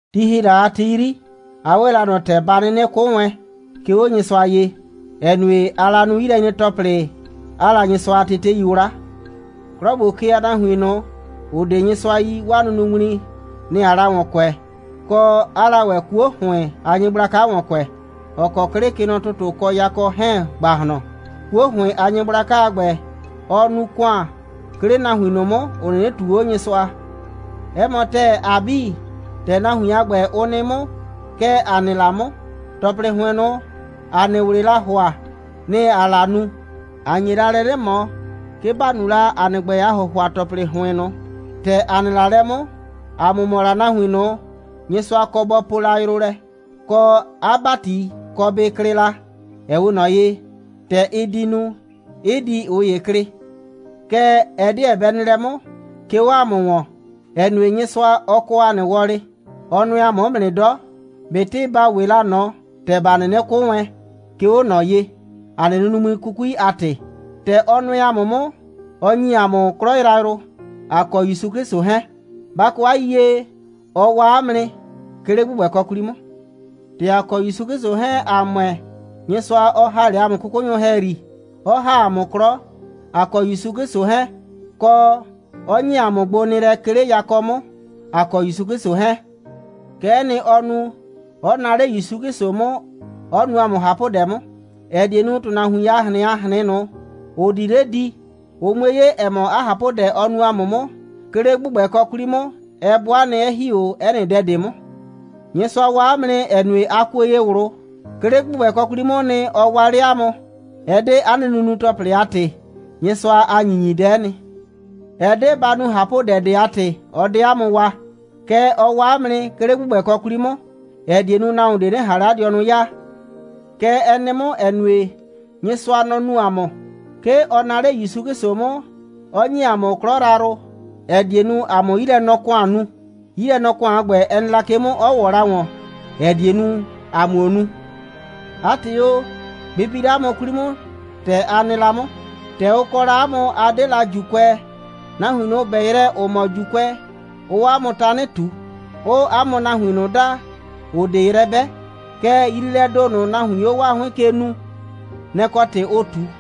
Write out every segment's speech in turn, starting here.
Ti ‑hi la a ti 'yri, a 'we la ꞊nɔ ‑tɛ ba 'nɩnɩ 'kʋ wɛn, 'ke 'o Nyɩsʋa ye, ‑ɛ nue, aa la nu 'yilɛnyre‑tɔplɩ, 'aa la Nyɩsʋa a tetei 'wla. 'Klɔ ‑gbo ke a nahuin ꞊nʋ, ‑ʋ 'de Nyɩsʋa yi, 'waa nunuŋmli, nɩ‑ aa la ‑wɔn kʋɛ, kɔ, 'aa la ‑wɛ 'kuo ‑hʋɩn a nyɩgblaka ‑wɔn kʋɛ, ‑ɔ kɔ 'klɩ, kɛ nɔ ‑tʋtʋ kɔ yakɔ 'hɛɛn ‑gbahlɔn. 'Kuo ‑hʋɩn a nyɩgblaka a ‑gbɛ, ɔɔ nu ‑kʋan, 'ke 'le nahuin ꞊nʋ 'mʋ, ‑ʋ 'nɩnɩ ꞊tuu 'o Nyɩsʋa. 'Ɛ mɔ ‑tɛɛ, ‑a 'bii, ‑tɛ nahuin a ‑gbɛ, ʋ nɩ 'mʋ, kɛ ‑a nɩ la 'mʋ. ‑Tɔplɩ ‑hʋɩn ꞊nʋ, ‑a nɩ ꞊wlɩɩ la ‑hʋa, nɩ‑ ‑aa la nu. ‑A nye la lɛ 'nɩ ꞊mɔ, 'ke ‑ba nu la ‑a nɩ ‑gbɛ a ‑hʋhʋa‑tɔplɩ ‑hʋɩn ꞊nʋ. ‑Tɛ ‑a nɩ la lɛ 'mʋ, ‑a mʋ mɔ la nahuin ꞊nʋ, Nyɩsʋa kɔ bɔ poo la yrʋ lɛ, kɔ, 'a ‑bati kɔ bɩ klɩ la, ‑ɛ 'we ꞊nɔ ye, ‑tɛ ɩ di nu, 'ɩ di ꞊ʋ ‑ye klɩ. Kɛɛ, ɛ 'deɛ bɛ nɩ lɛ 'mʋ, 'ke 'o ‑a mʋ ‑wɔn, ‑ɛ nue, Nyɩsʋa, ɔ kɔ ‑a nɩ wɔlɩ. Ɔ nʋɛ ‑a mʋ 'mʋ nɩ 'dɔ, ꞊betɩ ‑ba 'we la ꞊nɔ ‑tɛ ‑ba 'nɩnɩ 'kʋ wɛn, 'ke 'o ꞊nɔ ye, ‑a nɩ nunuŋmli 'kukui a ‑tɩ. ‑Tɛ ɔ nʋɛ ‑a mʋ 'mʋ, ɔ ‑nyi ‑a mʋ 'klɔ yrayrʋ, ‑a kɔ ‑Yusu 'Klɩsʋ 'hɛɛn. Ba kɔ 'a yiyie: Ɔ waa 'a mʋ nɩ, 'ke 'le ‑gbʋgbɛkɔ 'kwli 'mʋ. ‑Tɛ ‑a kɔ ‑Yusu 'Klɩsʋ 'hɛɛn, ‑a ‑mʋɛ, Nyɩsʋa 'ɔ ‑ha 'le ‑a mʋ 'kʋkʋnyʋ ‑hɛyri, 'ɔ ‑ha ‑a mʋ 'klɔ, ‑a kɔ ‑Yusu 'Klɩsʋ 'hɛɛn, kɔ, 'ɔ ‑nye ‑a mʋ gbonɩɩlɛ, 'ke 'le yakɔ 'mʋ, ‑a kɔ ‑Yusu 'Klɩsʋ 'hɛɛn. Kɛ'ɛ nɩ, ɔ nu, 'ɔ naa 'le ‑Yusu 'Klɩsʋ 'mʋ, 'ɔ nu ‑a mʋ ꞊hapʋdɛ 'mʋ, ‑ɛ die nu, ‑tʋnahuin a ꞊hrɩn a ꞊hrɩn ꞊nʋ, ‑ʋ di 'le di, ʋ 'mue 'ye, ‑ɛ mɔ, 'a ꞊hapʋdɛ, ɔ nu ‑a mʋ 'mʋ, 'ke 'le ‑gbʋgbɛkɔ 'kwli 'mʋ, ɛ 'bʋa nɩ, 'ɛ ‑hi 'o 'ɛ nɩ dɛ ꞊de 'mʋ. Nyɩsʋa waa 'a mʋ nɩ, ‑ɛ nue, a kuo ye ꞊wlʋ. 'Ke 'le ‑gbʋgbɛkɔ 'kwli 'mʋʋ nɩ, ɔ waa 'le 'a mʋ. Ɛ 'de 'a nɩ nunu‑tɔplɩ a ‑tɩ. Nyɩsʋa a ‑nyinyidɛ'ɛ nɩ. Ɛ 'de ba nu ꞊hapʋdɛ ꞊de a ‑tɩ, ɔ 'de 'a mʋ waa. Kɛɛ, ɔ waa 'a mʋ nɩ, 'ke 'le ‑gbʋgbɛkɔ 'kwli 'mʋ, ‑ɛ die nu, nahuon ꞊de 'nɩ ꞊han 'le 'a dɩɔnʋ 'yaa. Kɛ ɛ nɩ 'mʋ, ‑ɛ nue, Nyɩsʋa, nɔ‑ nu ‑a mʋ. 'Ke ɔ naa 'le ‑Yusu 'Klɩsʋ 'mʋ, 'ɔ ‑nye ‑a mʋ 'klɔ yrayrʋ, ‑ɛ die nu, ‑a 'mʋ 'yilɛnɔ‑kʋan nu. 'Yilɛnɔ‑kʋan a ‑gbɛ, ɛ nɩ la ke 'mʋ, 'ɔ ‑wɔ la ‑wɔn, ‑ɛ die nu, ‑a 'muo nu. 'A ‑tɩ o, bɩ bi 'le 'a mʋ 'kwli 'mʋ, ‑tɛ a nɩ 'mʋ: ‑Tɛ ʋ kɔ la 'a mʋ, a 'de la ‑Juukʋɛ, nahuin ꞊nʋ, ‑ʋ 'bɛ yrɛ, ‑ʋ mɔ ‑Juukʋɛ, 'ʋʋ 'a mʋ tanɩ ꞊tu, 'ʋʋ 'a mʋ nahuin ꞊nʋ daa, ‑ʋ 'de yrɛ 'bɛ. Kɛɛ, yriilɛɛ ‑do ꞊nʋ, nahuiin 'o 'waa 'hʋɩn ke nuu, nɛ‑ kɔ ‑tɩ ʋʋ ꞊tu.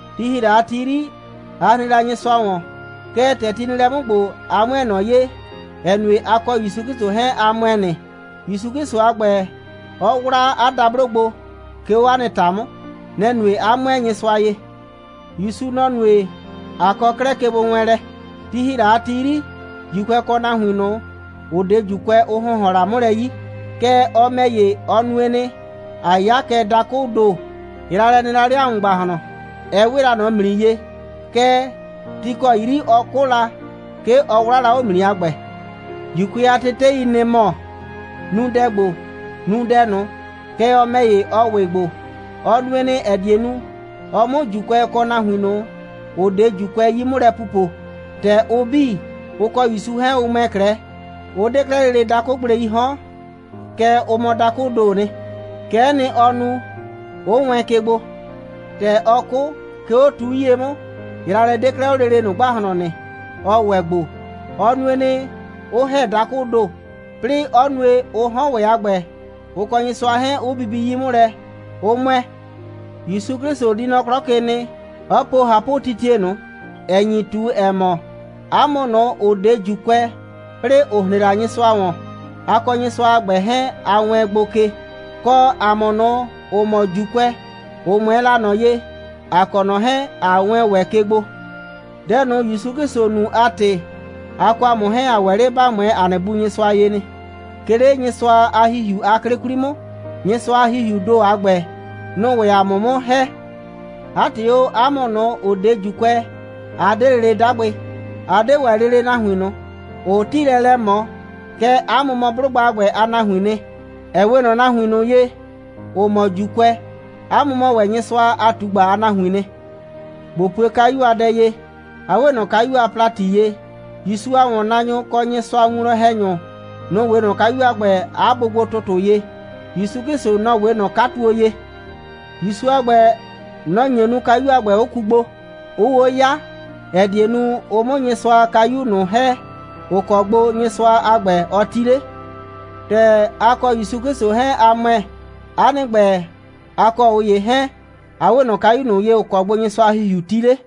Ti ‑hi la a ti 'yri, a hren la Nyɩsʋa ‑wɔn, kɛɛ, ‑tɛ ti nɩ lɛ 'mʋ ‑gbo, a 'mʋɛɛ ꞊nɔ ye, ‑ɛ nue, a kɔ ‑Yusu 'Klɩsʋ 'hɛɛn, a ‑mʋɛ nɩ. ‑Yusu 'Klɩsʋ a ‑gbɛ, ɔ 'wla 'a dablo gbo, 'ke 'o 'a nɩ ‑ta 'mʋ. Nɛ‑ nue, 'a 'mʋɛɛ Nyɩsʋa ye. ‑Yusu, nɔ‑ nue, ꞊a kɔ 'klɛɛ kegbowɛɛnlɛ. Ti ‑hi la a ti 'yri, ‑Juukʋɛ, kɔ nahuin ꞊nʋ, ‑ʋ 'de ‑Juukʋɛ, ʋ ‑hʋnhɔn la 'mʋ lɛ 'yi. Kɛɛ, ɔ ‑mɛ ‑ye, ɔ nue nɩ, ꞊a 'ya kɛ dakʋʋ ‑do. Yraalɛ nɩ la 'le ‑a mʋ ‑gbahlɔn, ɛ 'we la ꞊nɔ ‑mli ye. Kɛɛ, ti ‑kɔ 'yri ɔ 'kʋ la, 'ke ɔ 'wlaa la 'o ‑mli a ‑gbɛ. ‑Juukʋɛ a tetei, nɩ‑ mɔ: Nu dɛ ‑gbo, nu dɛ ꞊nʋ. Kɛɛ, ɔ ‑mɛ ‑ye, ɔ ‑wɩ gbo. Ɔ nue nɩ, ‑ɛ die nu, ɔ 'mʋ ‑Juukʋɛ kɔ nahuin ꞊nʋ, ‑ʋ 'de ‑Juukʋɛ 'yi 'mʋ lɛ pupo. ‑Tɛ ʋ 'bii, ʋ kɔ ‑Yusu 'hɛɛn, ʋ ‑mʋɛ 'klɛɛ, ʋ 'de 'klɛɛ lele dakʋgbleii 'hɔn, kɛɛ, ʋ mɔ dakʋʋ ‑doo nɩ. Kɛ'ɛ nɩ, ɔ nu, 'ʋ wɛɛn ke gbo. ‑Tɛ ɔ 'kʋ, 'ke 'o tu 'yie 'mʋ, yraalɛ 'de 'klɛɛ 'o lele ꞊nʋ ‑gbahlɔn nɩ. Ɔ ‑wɛ gbo. Ɔ nue nɩ, 'ʋ ‑hɛ dakʋʋ ‑do, 'plɩɩ 'ɔ nue, ʋ 'hɔn ‑wɛ a ‑gbɛ, ʋ kɔ Nyɩsʋa 'hɛɛn, 'ʋ bibi 'yi 'mʋ lɛ, 'ʋ ‑mʋɛ. ‑Yusu 'Klɩsʋ di nɔ 'klɔ ke nɩ, 'ɔ po ꞊hapʋtitie ꞊nʋ, ‑ɛ nyi ꞊tu, ‑ɛ mɔ, 'a mʋ ꞊nʋ, ‑ʋ 'de ‑Juukʋɛ, 'plɩɩ ‑ʋ hren la Nyɩsʋa ‑wɔn, a kɔ Nyɩsʋa a ‑gbɛ 'hɛɛn, a wɛɛn gbo ke, kɔ, ‑a mʋ ꞊nʋ, ‑ʋ mɔ ‑Juukʋɛ, ‑ʋ 'mʋɛɛ la ꞊nɔ ye, ‑a kɔ ꞊nɔ 'hɛɛn, ꞊a wɛɛn ‑wɛ ke gbo. Dɛ ꞊nʋ, ‑Yusu 'Klɩsʋ nu a ‑tɩ, a kɔ ‑a mʋ 'hɛɛn, ‑a ‑wɛ 'le ‑ba 'mʋɛɛ ‑a nɩ Bu Nyɩsʋa ye nɩ, 'ke 'le Nyɩsʋa a ‑Hihiu a 'klɩ 'kwli 'mʋ. Nyɩsʋa a ‑Hihiuu ‑do a ‑gbɛ, nʋ‑ʋ ‑wɛ ‑a mʋ 'mʋ ‑hɛ. 'A ‑tɩ o, 'a mʋ ꞊nʋ, ‑ʋ 'de ‑Juukʋɛ, a 'de lele 'dagbɩ, a 'de ‑wɛ lele nahuin ꞊nʋ, ‑ʋʋ 'tiilɛ lɛ ꞊mɔ, kɛɛ, 'a mʋ mɔ 'blʋgba a ‑gbɛ a nahuiin nɩ, ‑ɛ 'we ꞊nɔ nahuin ꞊nʋ ye, ‑ʋ mɔ ‑Juukʋɛ. 'A mʋ mɔ ‑wɛ Nyɩsʋa a ꞊tugba a nahuiin nɩ. ꞊Bo pue kayu a dɛ ye. A 'we ꞊nɔ kayu a ‑plati ye. ‑Yusu a ‑wɔnnaanyʋ, kɔ Nyɩsʋa a winwlɔn‑hɛnyʋ, nʋ‑ 'we ꞊nɔ kayu a ‑gbɛ a bʋgbo‑tʋtʋ ye. ‑Yusu 'Klɩsʋ, nɔ‑ 'we ꞊nɔ 'katuo ye. ‑Yusu a ‑gbɛ, nɔ‑ nye nu, kayu a ‑gbɛ 'ʋ ku gbo, 'ʋʋ 'o 'ya, ‑ɛ die nu, ʋ 'mʋ Nyɩsʋa a kayu ꞊nʋ ‑hɛ, ‑ʋ kɔ gbo Nyɩsʋa a ‑gbɛ, ɔ 'ti 'le. ‑Tɛ a kɔ ‑Yusu 'Klɩsʋ 'hɛɛn, a ‑mʋɛ, 'a nɩ ‑gbɛ, a kɔ ꞊ʋ ‑ye 'hɛɛn, a 'we ꞊nɔ kayu ꞊nʋ ye, ‑ʋ kɔ gbo Nyɩsʋa a ‑Hihiu 'ti 'le.